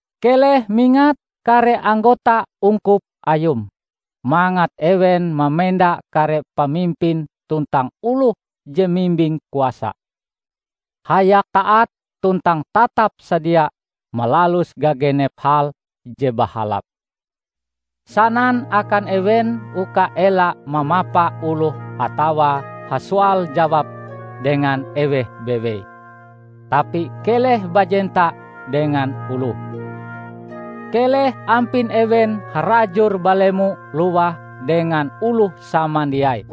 Keleh mingat kare anggota ungkup ayum mangat ewen mamenda kare pamimpin tuntang oloh je mimbing kuasa, hayak taat tuntang tatap sadia malalus gagenep hal je bahalap. Sanan akan ewen uka ela mamapa oloh atawa hasoal-jawab dengan eweh bewei, tapi keleh bajenta dengan oloh. Keleh ampin ewen harajur balemo lowah dengan oloh samandiai.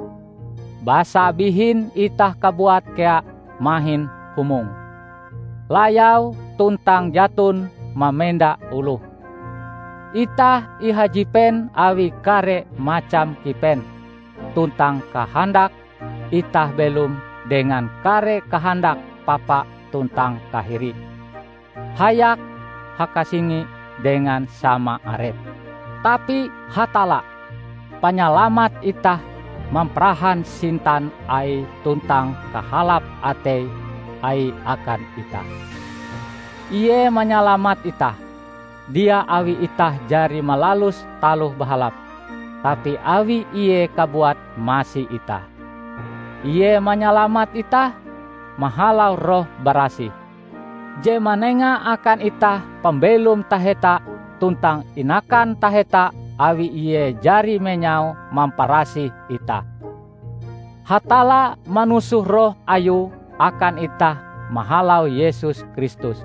Basa bihin itah kabuat kea mahin humong, layau tuntang jaton mamenda oloh. Itah ihajipen awi kare macam kipen tuntang kahandak; itah belom dengan kare kahandak papa tuntang kahiri, hayak hakasingi dengan sama arep. Tapi Hatalla, Panyalamat itah mamparahan sintan Aie tuntang kahalap atei Aie akan itah. Ie manyalamat itah, dia awi itah jari malalus taloh bahalap, tapi awi Ie kabuat masi itah. Ie manyalamat itah mahalau Roh Barasih, je manenga akan itah pambelom taheta tuntang inakan taheta awi Ie jari menyau-mamparasih itah. Hatalla manusoh Roh Ayue akan itah mahalau Yesus Kristus,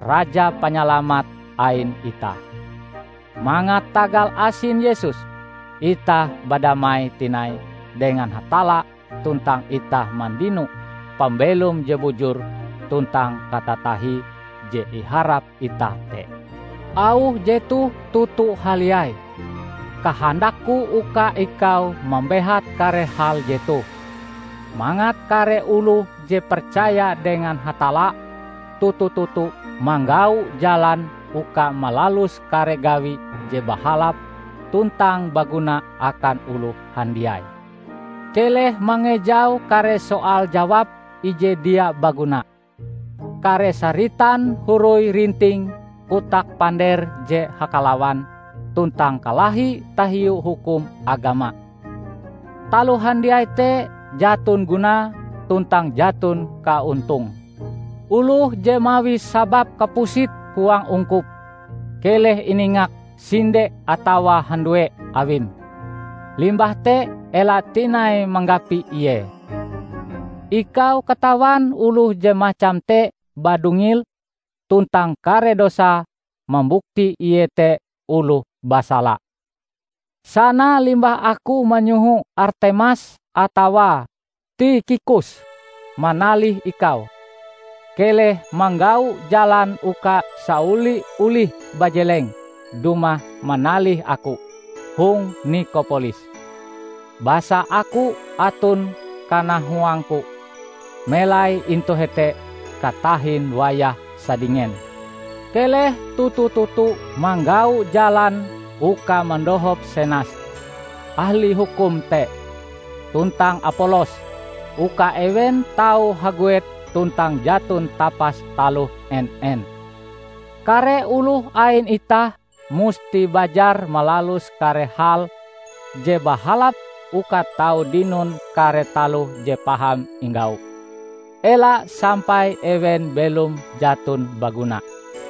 Raja Panyalamat ain itah, mangat tagal asin Yesus, itah badamai tinai dengan Hatalla tuntang itah mandino pambelom je bujur tuntang katatahie je iharap itah te. Auh jetoh toto haliai. Kahandakku uka ikau mambehat kare hal jetoh, mangat kare oloh je percaya dengan Hatalla toto-toto manggau jalan uka malalus kare gawi je bahalap tuntang baguna akan oloh handiai. Keleh mangejau kare soal-jawab ije dia baguna, kare saritan horoi-rinting, kotak-pander je hakalawan tuntang kalahi tahiu hukum agama. Taloh handiai te jaton gunae tuntang jaton kaontonge. Oloh je mawi sabab kapusit huang ungkup, keleh iningak sinde atawa handue awim; limbah te ela tinai manggapi ie. Ikau katawan oloh je macam te badungil tuntang kare dosae mambukti ie te oloh basala. Sana limbah aku manyoho Artemas atawa Tikhikus manalih ikau, keleh manggau jalan uka saoli-olih bajeleng dumah manalih aku hong Nikopolis, basa aku aton kanahuangku melai intu hete katahin wayah sadingen. Keleh toto-toto manggau jalan uka mandohop Senas, ahli hukum te, tuntang Apolos, uka ewen tau haguet tuntang jaton tapas taloh en-en. Kare oloh ain itah musti bajar malalus kare hal je bahalap uka tau dinon kare taloh je paham inggau; ela sampai ewen belom jaton baguna.